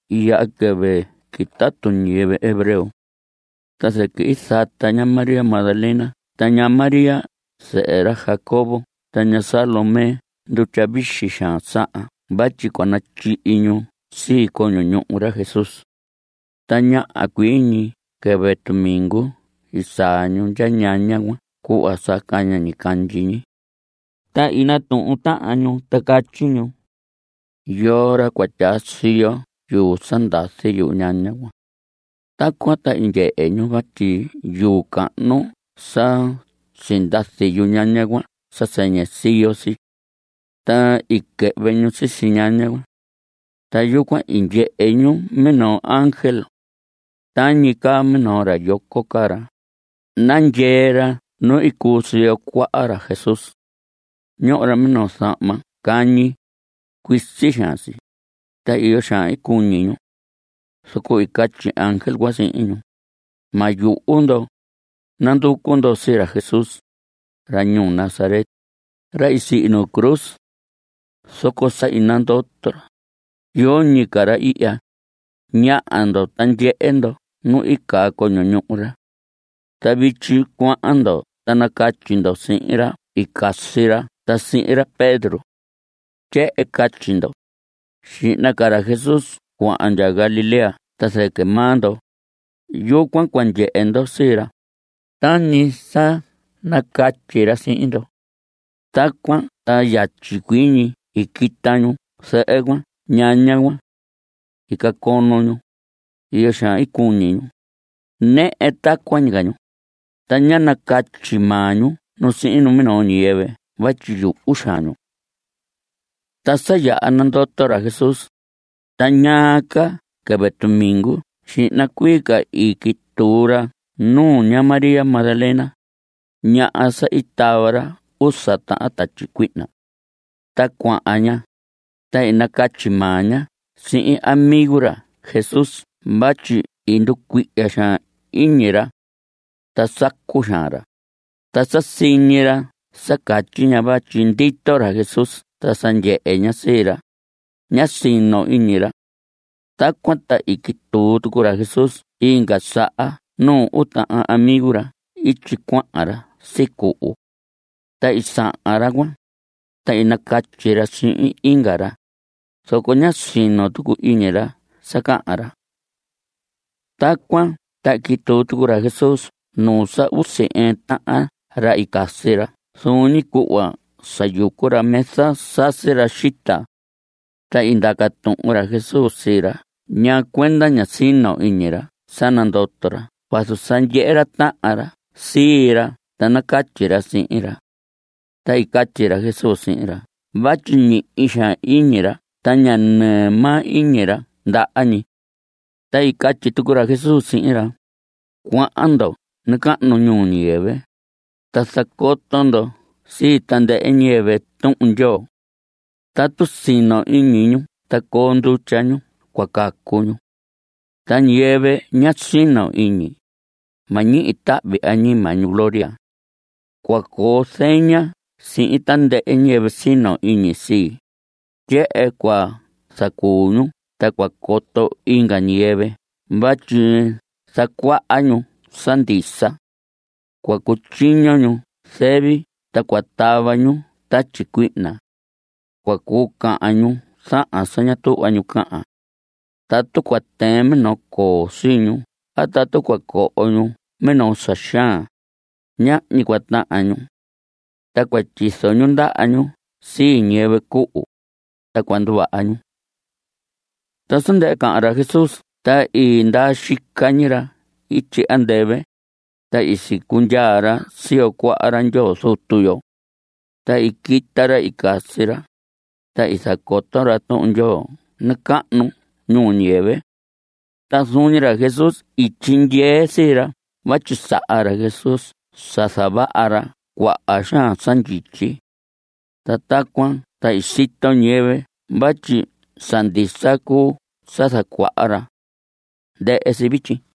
I yaha quɨvɨ quitatu ñiyɨvɨ hebreo. Ta zɨquɨ i zata ña María Magdalena ta ña María zɨhɨ ra Jacobo ta ña Salomé ndutya vixi xaan sahan vatyi cua natyihi ñu sii coño ñuhu ra Jesús. Ta ñaha cuii ñi quɨvɨ tumingu i saa ñu ndya ñaña cuan cuhva sa caña ñicandyi ñi. Ta i natuhun tahan ñu ta catyi ñu: ¿Yoo ra cua tyaa siyo yuu sa ndazi yuñaña cuan? Tacuan ta i ndyehe ñu vatyi yuu cahnu sa sindazi yuñaña cuan sa sɨñɨ siyo si. Ta i quɨhvɨ ñu sisi ñaña cuan. Ta yucuan i ndyehe ñu minoo ángel. Tañi caa minoo ra yoco caa ra. Nandyee ra nu i cuu si siyo cuaha ra Jesús. Ñoho ra minoo zahma cañi. Cuisi xaan si. Ta iyo xaan i cuñi ñu. Zoco i catyi ángel cuan sihin ñu: Ma yuhu ndo. Nanducu ndo sii ra Jesús, ra ñuu Nazaret, ra i sihi nu cruz. Zoco sa i nandoto ra. Yoñi ca ra ihya. Ñaha ndo, ta ndyehe ndo nu i caa coño ñuhu ra. Ta vityi cuahan ndo ta nacatyi ndo sihin ra i casi ra ta sihin ra Pedro. Tyehen catyi ndo: “Xihna ca ra Jesús cuahan ndya Galilea ta zɨquɨ maa ndo. Yucuan cua ndyehe ndo sii ra, tañi sa nacatyi ra sihin ndo.” Tacuan ta yatyi cuii ñi i quita ñu zɨhɨ cuan ñaña cuan. I cacono ñu. Iyo xaan i cuñi ñu. Nɨhɨ tacuan ñi ca ñu. Ta ñá nacatyi maa ñu nu sihin minoo ñiyɨvɨ vatyi yuhu xaan ñu. Ta sa yaha nandoto ra Jesús, ta ñaa ca quɨvɨ tumingu xihna cuii ca i quituu ra nuu ña María Magdalena, ñaha sa i tava ra usa tahan tatyi cuihna. Ta cuahan ña, ta i nacatyi maa ña sihin amigo ra Jesús vatyi i nducuihya xaan iñi ra. Ta sacu xaan ra. Ta sa siñi ra sa catyi ña vatyi ndito ra Jesús ta sa ndyehe ña sii ra, ñá sino iñi ra. Tacuan ta i quituu tucu ra Jesús inga saha nuu uu tahan amigo ra ityi cuahan ra sicuhu. Ta i sahan ra cuan, ta i nacatyi ra sihin inga ra, zoco ñá sino tucu iñi ra sa cahan ra. Tacuan ta i quituu tucu ra Jesús nuu sa usi ɨɨn tahan ca ra i casi ra zuun ñi cuhva sa yucu ra mesa sasi ra xita. Ta i ndaca tuhun ra Jesús sii ra ñaa cuenda ña sino iñi ra sa nandoto ra vazu sa ndyehe ra tahan ra sii ra ta nacatyi ra sihin ra. Ta i catyi ra Jesús sihin ra vatyi ñihi xaan iñi ra ta ña nɨɨ maa iñi ra ndaha ñi. Ta i catyi tucu ra Jesús sihin ra: Cuahan ndo nacahnu ñuu ñiyɨvɨ, ta zacoto ndo sii tandɨhɨ ñiyɨvɨ Tuhun Ndyoo. Tatu sino iñi ñu ta coo ndutya ñu cua cacu ñu. Ta ñiyɨvɨ ña sino iñi, ma ñihi tahvi añima ñu gloria. Cua coo zeña sihin tandɨhɨ ñiyɨvɨ sino iñi sii. Tyehen cua zacuu ñu ta cua coto inga ñiyɨvɨ vatyi zacuaha ñu sa ndisa. Cua cutyiño ñu zɨvi ta cua tava ñu tatyi cuihna. Cua cuu cahan ñu zahan sa ña tuhva ñu cahan. Tatu cua tɨɨn minoo coo sii ñu a tatu cua coho ñu minoo sa xaan, ñahñi cua tahan ñu. Ta cua tyizo ñu ndaha ñu sii ñiyɨvɨ cuhu, ta cua nduvaha ñu. Ta sa ndɨhɨ cahan ra Jesús ta i ndaa xica ñi ra ityi andɨvɨ, ta i sicundyaa ra siyo cuaha ra Ndyoo Zutu yo. Ta i quita ra i casi ra, ta i zacoto ra Tuhun Ndyoo nacahnu ñuu ñiyɨvɨ. Ta zuun ñi ra Jesús i tyindyee sii ra vatyi saha ra Jesús sa zavaha ra cuaha xaan sa ndyityi. Ta tacuan ta i sito ñiyɨvɨ vatyi sa ndisa cuu sa zacuaha ra. Ndɨhɨ si vityi.